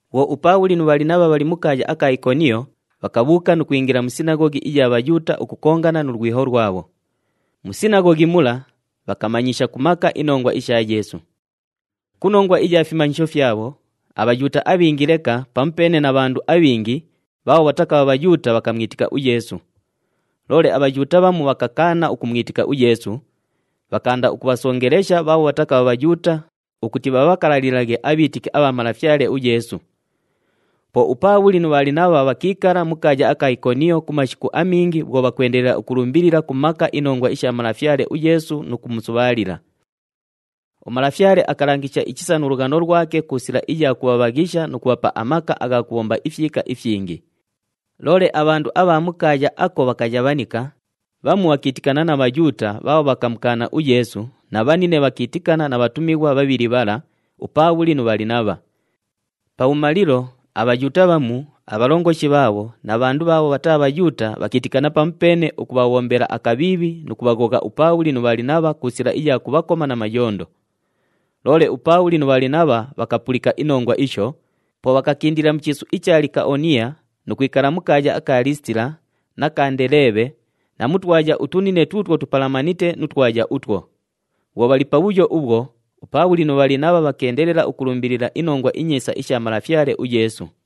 Bhwo uPaabhuli nu Bhalinabha bhali mu kaaya aka Ikoniyo, bhakabhuuka nu kwingila mu sinaghoghi iya Bhayuuta ukukongana nu lwiho lwabho. Mu sinaghoghi mula bhakamanyisha ku maka inongwa isha Yeesu. Ku nongwa iya fimanyisho fyabho, aBhayuuta abhingi leka pamupeene na bhandu abhingi bhaabho bhatakabha Bhayuuta bhakamwitika uYeesu. Loole aBhayuuta bhamu bhakakaana ukumwitika uYeesu, bhakaanda ukubhasongelesha bhaabho bhatakabha Bhayuuta ukuti bhabhakalalilaghe abhiitiki abha Malafyale uYeesu. Po uPaabhuli nu Bhalinabha bhakiikala mu kaaya aka Ikoniyo ku mashiku amingi bhwo bhakwendelela ukulumbilila ku maka inongwa isha Malafyale uYeesu nu kumusubhaalila. UMalafyale akalangishanga ichisa nu lughano lwake ku sila iya kubhabhaghisha nu kubhapa amaka agha kubhomba ifyika ifyingi. Loole abhandu abha mu kaaya ako bhakayabhanika, bhamu bhakiitikana na Bhayuuta bhaabho bhakamukaana uYeesu na bhanine bhakiitikana na bhatumighwa bhabhili bhala, uPaabhuli nu Bhalinabha. Pabhumalilo, aBhayuuta bhamu, abhalongoshi bhaabho na bhandu bhaabho bhataa Bhayuuta, bhakiitikana pamupeene ukubhabhombela akabhiibhi nu kubhaghogha uPaabhuli nu Bhalinabha ku sila iya kubhakoma na mayondo. Loole uPaabhuli nu Bhalinabha bhakapulika inongwa isho, po bhakakindila mu chiisu icha Likaoniya nu kwikala mu kaaya aka Liisitila na ka Ndeleebhe na mu twaya utunine tuutwo tupalamanite nu twaya utwo. Bhwo bhali pabhuyo ubhwo, uPaabhuli nu Bhalinabha bhakeendelela ukulumbilila iNongwa iNyiisa isha Malafyale uYeesu.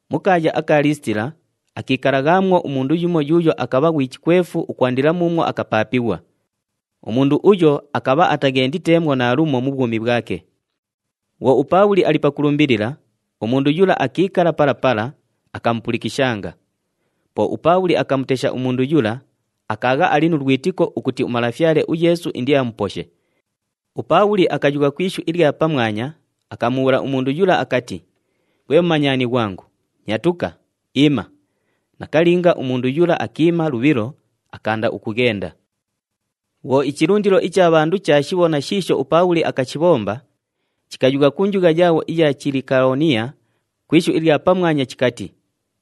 Mu kaaya aka Liisitila, akiikalaghaamwo umundu yumo yuuyo akabha ghwi chikwefu ukwandila muumwo akapaapighwa. Umundu uyo akabha ataghenditeemwo naalumo mu bhwumi bhwake. Bhwo uPaabhuli ali pakulumbilila, umundu yula akiikala pala pala, akamupulikishanga. Po uPaabhuli akamutesha umundu yula, akaagha ali nu lwitiko ukuti uMalafyale uYeesu indiamuposhe. UPaabhuli akayugha ku ishu ilya pamwanya, akamubhuula umundu yula akati, “Ghwe mumanyani ghwangu, nyatuka, iima!” Nakalinga, umundu yula akiima lubhilo, akaanda ukughenda. Bhwo ichilundilo icha bhandu chaashibhona shiisho uPaabhuli akashibhomba, chikayugha ku njugha yaabho iya Chilikaoniya ku ishu ilya pamwanya chikati,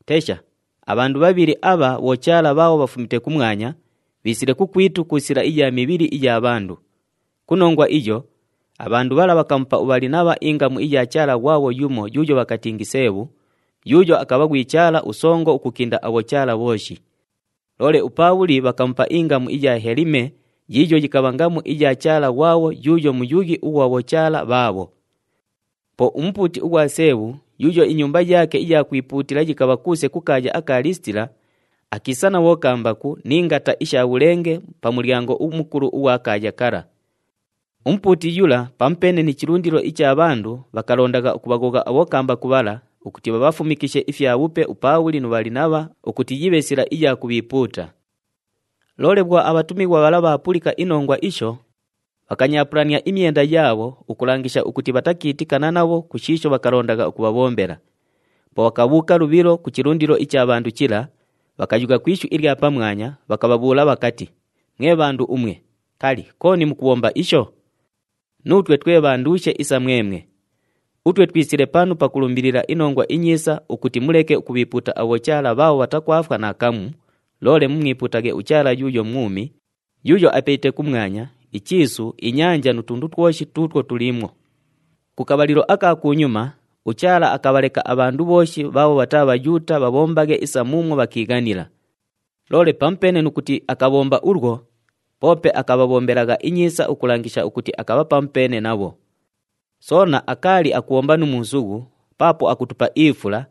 “Tesha! Abhandu bhabhili abha bhochaala bhaabho bhafumite kumwanya, bhiisile kukwitu ku sila iya mibhili iya bhandu!” Ku nongwa iyo, abhandu bhala bhakamupa uBhalinabha ingamu iya chaala ghwabho yumo yuuyo bhakatingi Seebhu, yuuyo akabha ghwi chaala usongo ukukinda abhochaala bhooshi. Loole uPaabhuli bhakamupa ingamu iya Helime yiiyo yikabha ngamu ya chaala ghwabho yuuyo muyughi ughwa bhochaala bhaabho. Po umupuuti ughwa Seebhu yuuyo inyumba yaake iya kwipuutila yikabha kuuse ku kaaya aka Liisitila, akiisa na bhokambaku ni ngata isha bhulenge pa mulyango umukulu ughwa kaaya kala. Umupuuti yula pamupeene ni chilundilo icha bhandu bhakalondagha ukubhaghogha abhokambaku bhala ukuti bhabhafumikishe ifyabhupe uPaabhuli nu Bhalinabha ukuti yibhe sila iya kubhiipuuta. Loole bhwo abhatumighwa bhala bhaapulika inongwa isho, bhakanyaapulania imyenda yaabho ukulangisha ukuti bhatakiitikana nabho ku shiisho bhakalondagha ukubhabhombela. Po bhakabhuuka lubhilo ku chilundilo icha bhandu chila, bhakayugha ku ishu ilya pamwanya, bhakabhabhuula bhakati, “Mwe bhandu umwe, kali, kooni mukubhomba isho? Nuutwe twe bhanduushe isa mwemwe! Utwe twisile panu pakulumbilila iNongwa iNyiisa ukuti muleke ukubhiipuuta abhochaala bhaabho bhatakwafwa naakamu, loole mumwipuutaghe uChaala yuuyo mwumi, yuuyo apelite kumwanya, ichiisu, inyanja nu tundu twoshi tuutwo tuliimwo. Ku kabhalilo aka kunyuma, uChaala akabhaleka abhandu bhooshi bhaabho bhataa Bhayuuta bhabhombaghe isa muumwo bhakiighanila. Loole pamupeene nu kuti akabhomba ulwo, poope akabhabhombelagha inyiisa ukulangisha ukuti akabha pamupeene nabho. Soona akaali akubhomba nu muusughu paapo akutupa ifula,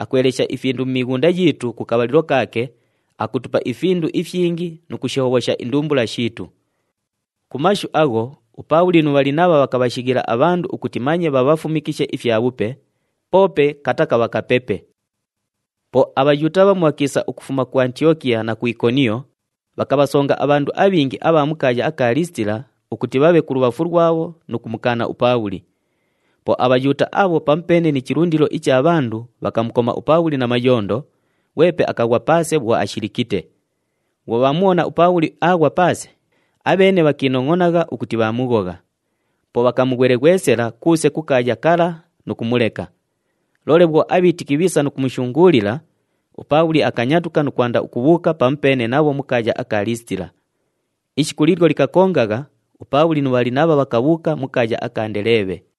akwelesha ifindu mu mighunda yiitu ku kabhalilo kaake, akutupa ifindu ifyingi nu kushihobhosha indumbula shiitu.” Ku mashu agho uPaabhuli nu Bhalinabha bhakabhashighila abhandu ukuti manye bhabhafumikishe ifyabhupe, poope kutakabha kupepe. Po aBhayuuta bhamu bhakiisa ukufuma ku Antiyokiya na ku Ikoniyo, bhakabhasonga abhandu abhingi abha mu kaaya aka Liisitila ukuti bhabhe kulubhafu lwabho nu kumukaana uPaabhuli. Po aBhayuuta abho pamupeene ni chilundilo icha bhandu bhakamukoma uPaabhuli na mayondo, ghwepe akaghwa paase bhwo ashilikite. Bhwo bhaamubhona uPaabhuli aaghwa paase, abheene bhakiinongʼonagha ukuti bhaamughogha. Po bhakamughweleghwesela kuuse ku kaaya kala nu kumuleka. Loole bhwo abhiitiki bhiisa nu kumushunguulila, uPaabhuli akanyatuka nu kwanda ukubhuuka pamupeene nabho mu kaaya aka Liisitila. Ishiku liilyo likakongagha, uPaabhuli nu Bhalinabha bhakabhuuka mu kaaya aka Ndeleebhe.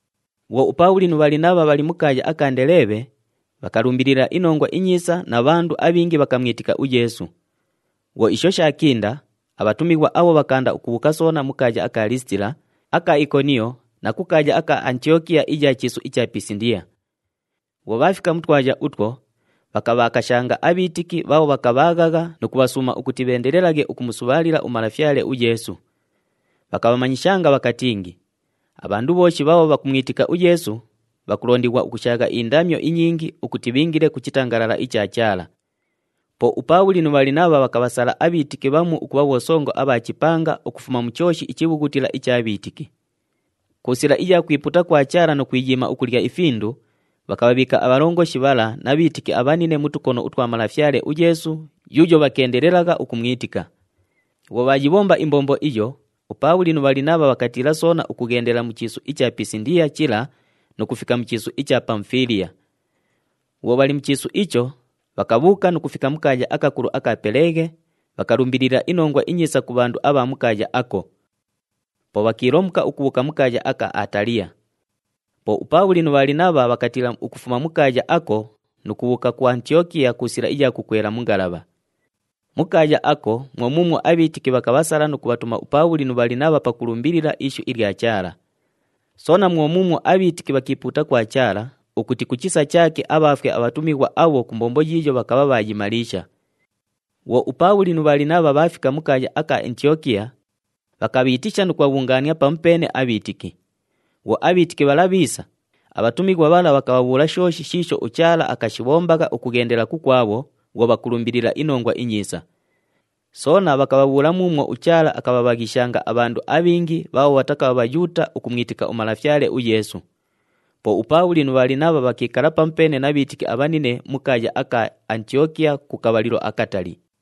Bhwo uPaabhuli nu Bhalinabha bhali mu kaaya aka Ndeleebhe, bhakalumbilila iNongwa iNyiisa na bhandu abhingi bhakamwitika uYeesu. Bhwo isho shaakinda, abhatumighwa abho bhakaanda ukubhuuka soona ku kaaya aka Liisitila, aka Ikoniyo na ku kaaya aka Antiyokiya iya chiisu icha Pisindiya. Bhwo bhaafika mu twaya utwo, bhakabhakashanga abhiitiki bhaabho bhakabhaaghagha nu kubhasuuma ukuti bheendelelaghe ukumusubhaalila uMalafyale uYeesu. Bhakabhamanyishanga bhakatingi, “Abhandu bhooshi bhaabho bhakumwitika uYeesu, bhakulondighwa ukushaagha indamyo inyingi ukuti bhiingile ku chitangalala icha Chaala.” Po uPaabhuli nu Bhalinabha bhakabhasala abhiitiki bhamu ukubha bhosongo abha chipanga ukufuma mu chooshi ichibhughutila icha bhiitiki. Ku sila iya kwipuuta kwa Chaala nu kwiyiima ukulya ifindu, bhakabhabhiika abhalongoshi bhala na bhiitiki abhanine mu tukono utwa Malafyale uYeesu yuuyo bhakeendelelagha ukumwitika. Bhwo bhaayibhomba imbombo iyo, uPaabhuli nu Bhalinabha bhakatiila soona ukughendela mu chiisu icha Pisindiya chila nu kufika mu chiisu icha Pamufiiliya. Bhwo bhali mu chiisu icho, bhakabhuuka nu kufika mu kaaya akakulu aka Peleghe, bhakalumbilila iNongwa iNyiisa ku bhandu abha mu kaaya ako. Po bhakiilomuka ukubhuuka mu kaaya aka Ataliya. Po uPaabhuli nu Bhalinabha bhakatiila ukufuma mu kaaya ako nu kubhuuka ku Antiyokiya ku sila iya kukwela mu ngalabha. Mu kaaya ako mwo muumwo abhiitiki bhakabhasala nu kubhatuma uPaabhuli nu Bhalinabha pakulumbilila ishu ilya Chaala. Soona mwo muumwo abhiitiki bhakiipuuta kwa Chaala, ukuti ku chisa chaake abhaafwe abhatumighwa abho ku mbombo yiiyo bhakabha bhaayimaliisha. Bhwo uPaabhuli nu Bhalinabha bhaafika mu kaaya aka Antiyokiya, bhakabhiitisha nu kubhabhungaania pamupeene abhiitiki. Bhwo abhiitiki bhala bhiisa, abhatumighwa bhala bhakabhabhuula shooshi shiisho uChaala akashibhombagha ukughendelela kukwabho bhwo bhakulumbilila iNongwa iNyiisa. Soona bhakabhabhuula muumwo uChaala akabhabhaghishanga abhandu abhingi bhaabho bhatakabha Bhayuuta ukumwitika uMalafyale uYeesu. Po uPaabhuli nu Bhalinabha bhakiikala pamupeene na bhiitiki abhanine mu kaaya aka Antiyokiya ku kabhalilo akatali.